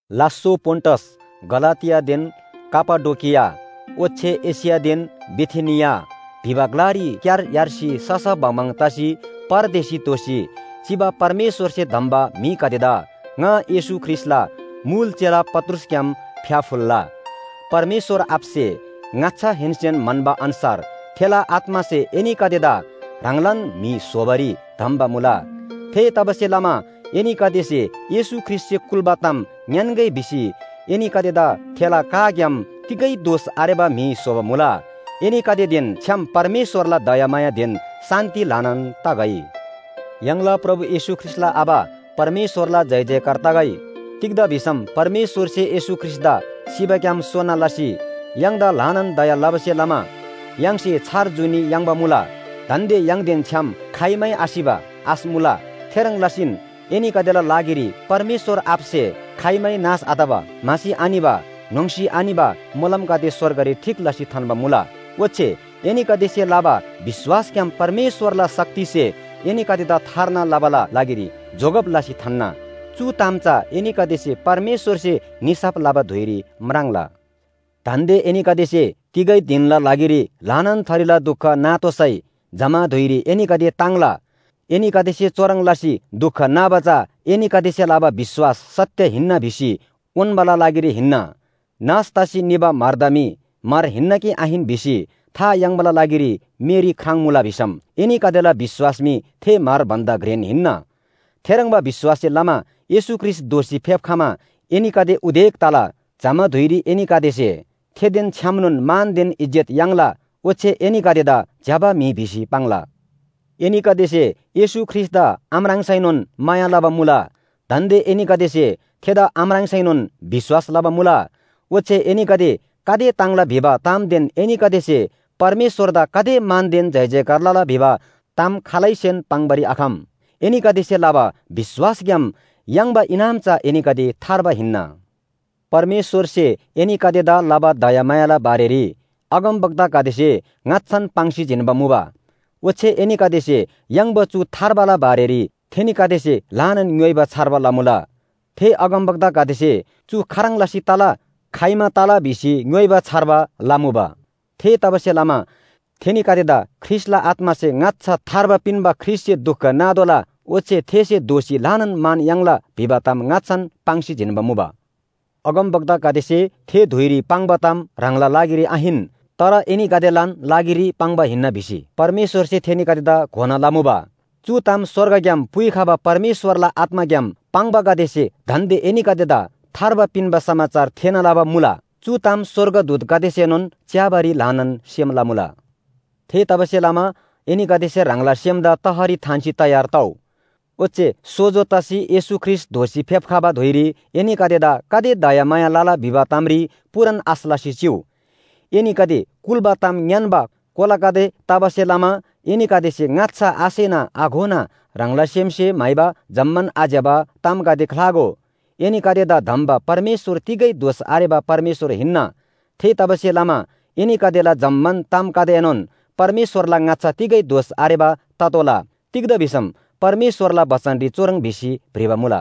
लास्‍सो, पोन्‍टस, गलातियादेन कापाडोकिया ओच्‍छे एशियादेन बिथिनिया भिबा ग्‍लारी क्‍यार यार्सी ससा बङबङ तसी परदेशी दोसी चिबा परमेश्‍वरसे धम्‍बा म्‍हिगदेदा ङा येशू ख्रीष्‍टला मुल चेला पत्रुसग्‍याम फ्‍याफुल्‍ला। परमेश्‍वर आबासे ङाच्‍छाहेन्‍सेन म्‍हन्‍बा अन्‍छार थेला आत्‍मासे एनीगदेदा ह्राङलान म्‍हि स्‍होबारी धम्‍बा मुला। थेतबासेलमा एनीगदेसे येशू ख्रीष्‍टसे कुल्‍बा ताम ङ्‌यान्‍गै भिसी एनीगदेदा थेला काग्‍याम तिगै दोष आरेबा म्‍हि स्‍होबा मुला। एनीगदेदेन छ्‌याम परमेश्‍वरला दयामायादेन शान्‍ति ल्‍हानान तगै। य्‍हाङला प्रभु येशू ख्रीष्‍टला आबा परमेश्‍वरला जयजयकार तगै। तिग्‍दा भिसम परमेश्‍वरसे येशू ख्रीष्‍टदा सिबाग्‍याम सोना लसी य्‍हाङदा ल्‍हानान दया लबासे लमा य्‍हाङसे छार जुनी याङ्बा मुला। दान्‍दे य्‍हाङदेन छ्‍याम खाइमै आसिबा आश मुला। थेह्रङ् लसीन एनीगदेला लागिरी परमेश्‍वर आबासे खाइमै नाश आतबा, म्‍हासी आनिबा, न्‍होङ्‌सी आनिबा मोलमगदे स्‍वर्गरी ठीक लसी थान्‍बा मुला। ओच्‍छे एनीगदेसे लबा विश्‍वासग्‍याम परमेश्‍वरला शक्तिसे एनीगदेदा थार्ना लबाला लागिरी जोगब लसी थान्‍ना। चु ताम चा एनीगदेसे परमेश्‍वरसे निसाफ लबा धुइरी म्राङ्ला। दान्‍दे एनीगदेसे तिगै धिनना लागिरी ल्‍हानान थरीला दुख नातोःसै जमा धुइरी एनीगदे ताङ्ला। एनीगदेसे चुह्रङ् लसी दुख नाबा चा एनीगदेसे लबा विश्‍वास सत्‍य हिन्‍ना भिसी उन्‍बाला लागिरी हिन्‍ना। नाश तसी निबा म्‍हरदा मी म्‍हर हिन्‍ना कि आहिन भिसी था याङ्बाला लागिरी मेरी ख्राङ्मुला भिसम एनीगदेला विश्‍वास मी थे म्‍हर भन्‍दा घ्रेन हिन्‍ना। थेह्रङ्बा विश्‍वाससे लमा येशू ख्रीष्‍ट दोःसी फेप्‍खमा एनीगदे उदेक तला। जमा धुइरी एनीगदेसे थेदेन छ्‌यामनोन मानदेन इज्‍जत याङ्ला, ओच्‍छे एनीगदेदा ज्‍यबा म्‍हि भिसी पाङ्ला। एनीगदेसे येशू ख्रीष्‍टदा आम्राङ्सैनोन माया लबा मुला। दान्‍दे एनीगदेसे थेदा आम्राङ्सैनोन विश्‍वास लबा मुला। ओच्‍छे एनीगदे गाते ताङ्ला भिबा तामदेन एनीगदेसे परमेश्‍वरदा गाते मानदेन जयजयकार लला भिबा ताम खालैसेन पाङ्‌बारी आखम। एनीगदेसे लबा विश्‍वासग्‍याम याङ्बा इनाम चा एनीगदे थार्बा हिन्‍ना। परमेश्‍वरसे एनीगदेदा लबा दयामायाला बारेरी अगमवक्तागदेसे ङाच्‍छान पाङ्सी जिन्‍बा मुबा। ओच्‍छे एनीगदेसे याङ्बा चु थार्बाला बारेरी थेनीगदेसे ल्‍हानान ङ्‌योइबा छार्बा लमुबा। थे अगमवक्तागदेसे चु खाह्रङ् लसी तला, खाइमा तला भिसी ङ्‌योइबा छार्बा लमुबा। थेतबासेलमा थेनीगदेदा ख्रीष्‍टला आत्‍मासे ङाच्‍छा थार्बा पिन्‍बा ख्रीष्‍टसे दुख नातोःला, ओच्‍छे थेसे दोःसी ल्‍हानान मान याङ्ला भिबा ताम ङाच्‍छान पाङ्सी जिन्‍बा मुबा। अगमवक्तागदेसे थे धुइरी पाङ्बा ताम ह्राङला लागिरी आहिन, तर एनीगदेलान लागिरी पाङ्बा हिन्‍ना भिसी परमेश्‍वरसे थेनीगदेदा घोना लमुबा। चु ताम स्‍वर्गग्‍याम पुइखबा परमेश्‍वरला आत्‍माग्‍याम पाङ्बागदेसे दान्‍दे एनीगदेदा थार्बा पिन्‍बा समाचार थेःना लबा मुला। चु ताम स्‍वर्गदूतगदेसेनोन च्‍याबारी ल्‍हानान सेम लमुला। थेतबासेलमा एनीगदेसे ह्राङला सेमदा तहरी थान्‍सी तयार तउ। ओच्‍छे सोजो तसी येशू ख्रीष्‍ट दोःसी फेप्‍खबा धुइरी एनीगदेदा गाते दयामाया लला भिबा तामरी पूरान आश लसी चिउ। एनीगदे कुल्‍बा ताम ङ्‌यान्‍बा कोलागदे तबासे लमा एनीगदेसे ङाच्‍छा आसेना आघोना ह्राङला सेमसे म्‍हाइबा जम्‍मान आज्‍यबा तामगदे ख्‍लागो। एनीगदेदा धम्‍बा परमेश्‍वर तिगै दोष आरेबा परमेश्‍वर हिन्‍ना। थेतबासेलमा एनीगदेला जम्‍मान तामगदेएनोन परमेश्‍वरला ङाच्‍छा तिगै दोष आरेबा ततोःला। तिग्‍दा भिसम परमेश्‍वरला बचनरी चुह्रङ् भिसी भ्रिबा मुला,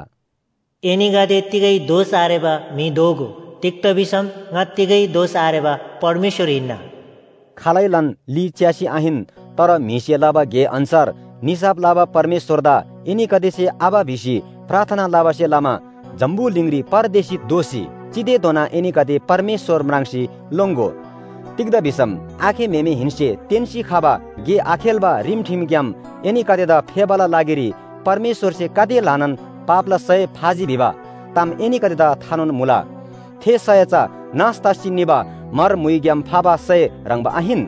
“एनीगदे तिगै दोष आरेबा म्‍हि दोगो, तिग्‍दा भिसम ङा तिगै दोष आरेबा परमेश्‍वर हिन्‍ना।” खालैलान ली च्‍यासी आहिन, तर म्‍हिसे लबा गे अन्‍छार निसाफ लबा परमेश्‍वरदा एनीगदेसे आबा भिसी प्रार्थना लबासे लमा जम्‍बुलिङरी परदेशी दोसी चितेधोना एनीगदे परमेश्‍वर म्राङ्सी लोङ्‍गो। तिग्‍दा भिसम आखे म्‍हेमेहेन्‍से तेन्‍सी खबा गे आखेल्‍बा रिमठिमग्‍याम एनीगदेदा फेबाला लागिरी परमेश्‍वरसे गाते ल्‍हानान पापला सय फाजी भिबा ताम एनीगदेदा थानोन मुला। थे सय चा नाश तसी निबा म्‍हर म्‍हुइग्‍याम फाबा सय ह्रङ्‌बा आहिन।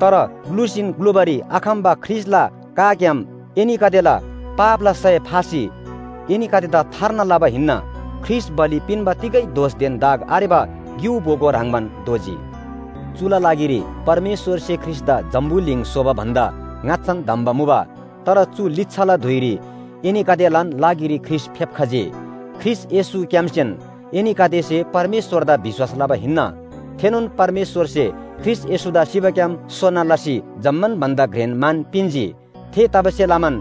तर ग्‍लुसीन ग्‍लुबारी आखम्‍बा ख्रीष्‍टला काग्‍याम एनीगदेला पापला सय फासी एनीगदेदा थार्ना लबा हिन्‍ना। ख्रीष्‍ट बलि पिन्‍बा तिगै दोषदेन दाग आरेबा ग्‍यु बोगो ह्रङ्‌बान दोजी। चुला लागिरी परमेश्‍वरसे ख्रीष्‍टदा जम्‍बुलिङ स्‍होबा भन्‍दा ङाच्‍छान धम्‍बा मुबा। तर चु लिच्‍छाला धुइरी एनीगदेलान लागिरी ख्रीष्‍ट फेप्‍खजी। ख्रीष्‍ट येशूग्‍यामसेन एनीगदेसे परमेश्‍वरदा विश्‍वास लबा हिन्‍ना। थेनोन परमेश्‍वरसे ख्रीष्‍ट येशूदा सिबाग्‍याम सोना लसी जम्‍मान भन्‍दा घ्रेन मान पिन्‍जी। थेतबासेलमान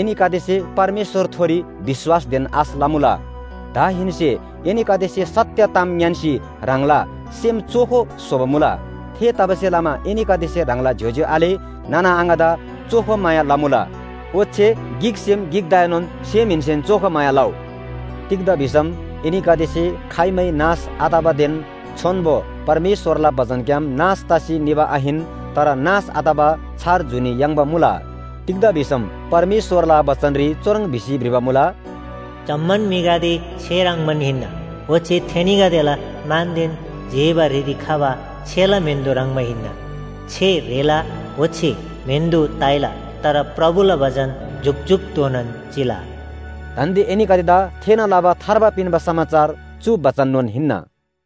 एनीगदेसे परमेश्‍वरथोरी विश्‍वासदेन आश लमुला। दाहेन्‍से एनीगदेसे सत्‍य ताम ङ्‌यान्‍सी ह्राङला सेम चोखो स्‍होबा मुला। थेतबासेलमा एनीगदेसे ह्राङला ज्‍योज्‍यो आले नाना आङादा चोखो माया लमुला। ओच्‍छे गिकसेम गिकदाएनोन सेमहेन्‍सेन चोखो माया लउ। तिग्‍दा भिसम एनीगदेसे खाइमै नाश आतबादेन छोन्‍बो परमेश्‍वरला बचनग्‍याम नाश तसी निबा आहिन, तर नाश आतबा छार जुनी याङ्बा मुला। तिग्‍दा भिसम परमेश्‍वरला बचनरी चुह्रङ् भिसी भ्रिबा मुला, “जम्‍मान म्‍हिगदे छे ह्रङ्‌बान हिन्‍ना, ओच्‍छे थेनीगदेला मानदेन जेबा ह्रिरी खबा छेला म्‍हेन्‍दो ह्रङ्‌बा हिन्‍ना। छे ह्रेला ओच्‍छे म्‍हेन्‍दो ताइला। तर प्रभुला बचन जुकजुकधोनान चिला।” दान्‍दे एनीगदेदा थेःना लबा थार्बा पिन्‍बा समाचार चु बचननोन हिन्‍ना।